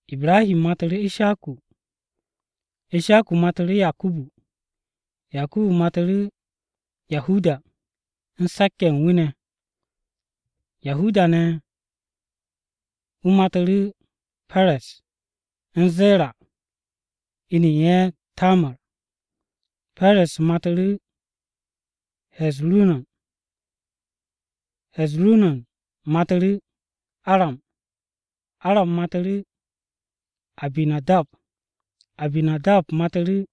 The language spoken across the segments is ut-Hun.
Ibrahi matu̱ru̱ Ishaku, Ishaku matu̱ru̱ Yakubu, Yakubu matu̱ru̱ Yahuda u̱n se̱k-ye̱ ye̱ u̱n wu̱ ne̱. Yahuda ne̱ wu̱ matu̱ru̱ Perez u̱n Zera (inu u̱n ye̱ Tamar). Perez matu̱ru̱ He̱zu̱ron, He̱zu̱ron matu̱ru̱ Aram, Aram matu̱ru̱ Aminadab, Aminadab matu̱ru̱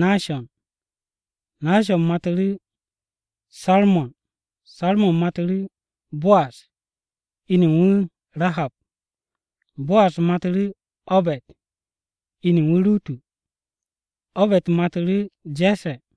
Nashon, Nashon matu̱ru̱ Sarmon. Sarmon matu̱ru̱ Bo'az (inu u̱n wu̱ Rahab), Bo'az matu̱ru̱ Obe̱d (inu u̱n wu̱ Rutu), Obe̱d matu̱ru̱ Je̱sse̱.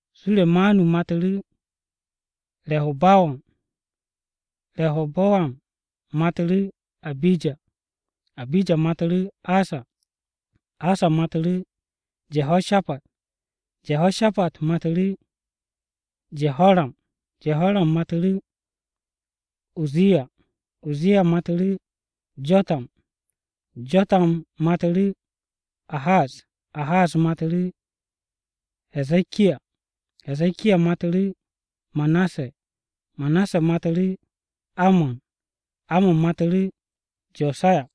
Suremanu matu̱ru̱ Re̱hebowam, Re̱hebowam matu̱ru̱ Abija, Abija matu̱ru̱ Asa, Asa matu̱ru̱ Je̱hoshapat, Je̱hoshapat matu̱ru̱ Je̱horam, Je̱horam matu̱ru̱ Uzziya. Uzziya matu̱ru̱ Jo̱tam, Jo̱tam matu̱ru̱ Ahaz, Ahaz matu̱ru̱ He̱ze̱kiya, He̱ze̱kiya matu̱ru̱ Manase, Manase matu̱ru̱ Amon, Amon matu̱ru̱ Jo̱saya.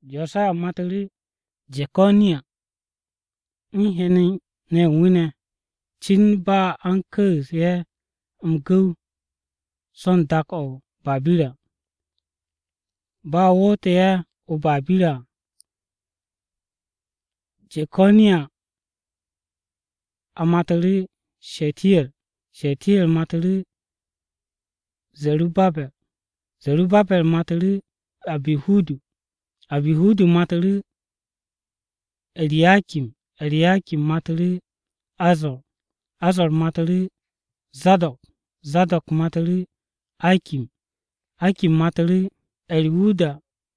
Jo̱saya matu̱ru̱ Je̱ko̱niya u̱n hen-ne̱ ye̱ u̱n wu̱ ne̱, cin ba a u̱n ku̱u̱s ye̱ m-gu̱w so̱ u̱n dak-o̱ o-Babira. Bo̱ a wo̱tte̱ ye̱ o-Babira à, Je̱ko̱niya matu̱ru̱ Shetiyer, Shetiyer matu̱ru̱ Ze̱rubabe̱r, Ze̱rubabe̱r matu̱ru̱ Abihudu, Abihudu matu̱ru̱ E̱riyakim, E̱riyakim matu̱ru̱ Azo̱r. Azo̱r matu̱ru̱ Zado̱k, Zado̱k matu̱ru̱ Akim, Akim matu̱ru̱ Eriwuda,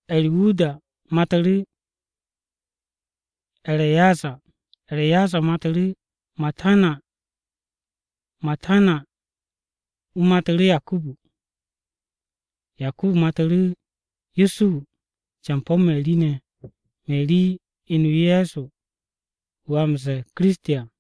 Eriwuda matu̱ru̱ E̱re̱yazar, E̱re̱yazar matu̱ru̱ Matana. Matana ne̱ wu̱ matu̱ru̱ Yakubu. Yakubu matu̱ru̱ Yusuhu campo̱ Meri, Meri inu Ye̱so wu̱ a m-ze̱e̱ Kiristi à.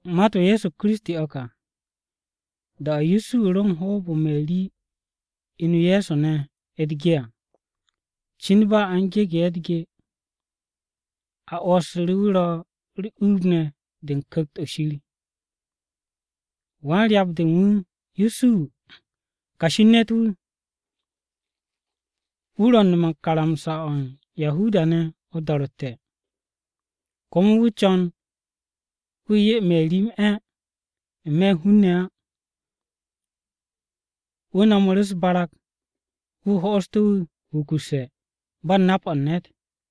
Mat-o Ye̱so Kiristi o̱ ka. Da-o̱ Yusuhu ro u̱n hoob-o Meri inu Ye̱so ne̱ u̱t-ge à, cin ba a u̱n gegu̱ ye̱ u̱t-ge, a 'wo̱ssu̱ru̱ wu̱ ro̱ u̱r-uub ne̱ de u̱n Ku̱kt-o̱ Shir. Wan-ryap-de u̱n wu̱ Yusuhu kashi u̱n ne̱t-wu̱, wu̱ ro̱ u̱n nome̱ u̱n karamsa-o̱ u̱n Yahuda-ne̱ o-do̱ro̱tte̱. Komo wu̱ co̱n wu̱ 'ye Meri m-'e̱ n-me̱ u̱n hun-ne̱ á, wu̱ no̱mu̱ru̱ u̱s-barag wu̱ ho'ostu̱ wu̱ wukusse̱ ba u̱n nap-o̱ u̱n ne̱t.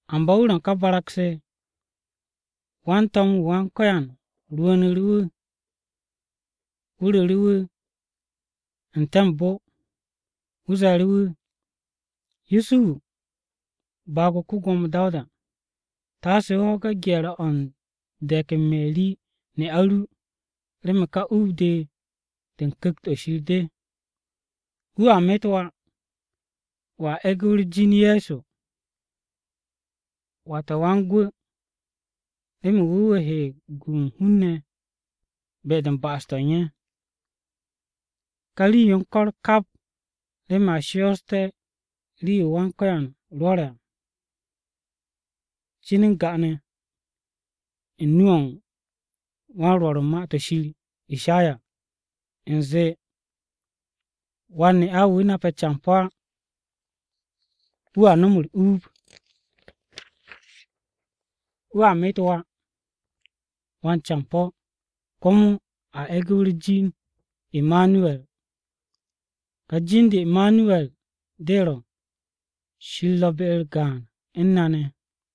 Amba wu̱ ro̱ u̱n ká barag-se, wan-to̱m-wu̱ Wan-Ko̱yan rwu̱u̱nu̱ru̱ wu̱ ru̱ru̱ wu̱ n-te̱ o-bo, wu̱ ze̱e̱ru̱ wu̱, “Yusuhu baag-o ko-Gwo̱mo Dawuda, taase o ho̱ge̱ gye̱r-o̱ u̱n de̱k u̱n Meri ne'a ru, remen ká uub-de, de u̱n Ku̱kt-o̱ Shir de. Wu̱a met wà, wo̱a e̱gu̱ wu̱ u̱r-jin Ye̱so. Wata wan-Gwu̱ remen wu̱ wu̱ he m-gu u̱n hun-ne̱ be-de u̱n ba'as-to̱ u̱n ye̱.” Ka rii-yo u̱n ko̱r kap remen a shooste̱ rii-yo Wan-Ko̱yan rwo̱re̱ à, cin n-ga ne̱ u̱n nu-o̱ u̱n wan-Rwo̱r u̱n Ma-to̱ ShirIshaya u̱nze, “Wan-ne'a-wu̱ nape̱ campo̱ á wu̱a nom u̱r-uub, wu̱a met wà, wan-campo̱. Komo a e̱gu̱ wu̱ u̱r-jin Imanuwe̱r.” Ka jin-de Imanuwe̱r de ro̱, Shir ro̱ be-u̱r gaan u̱n na ne̱.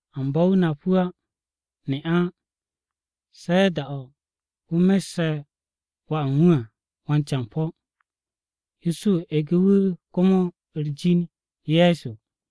Amba wu̱ nap wu̱ ne'a á, se̱ da-o̱ wu̱ messe̱ wà u̱n wu̱ à wan-campo̱. Yusuhu egu̱ wu̱ komo u̱r-jin Ye̱so.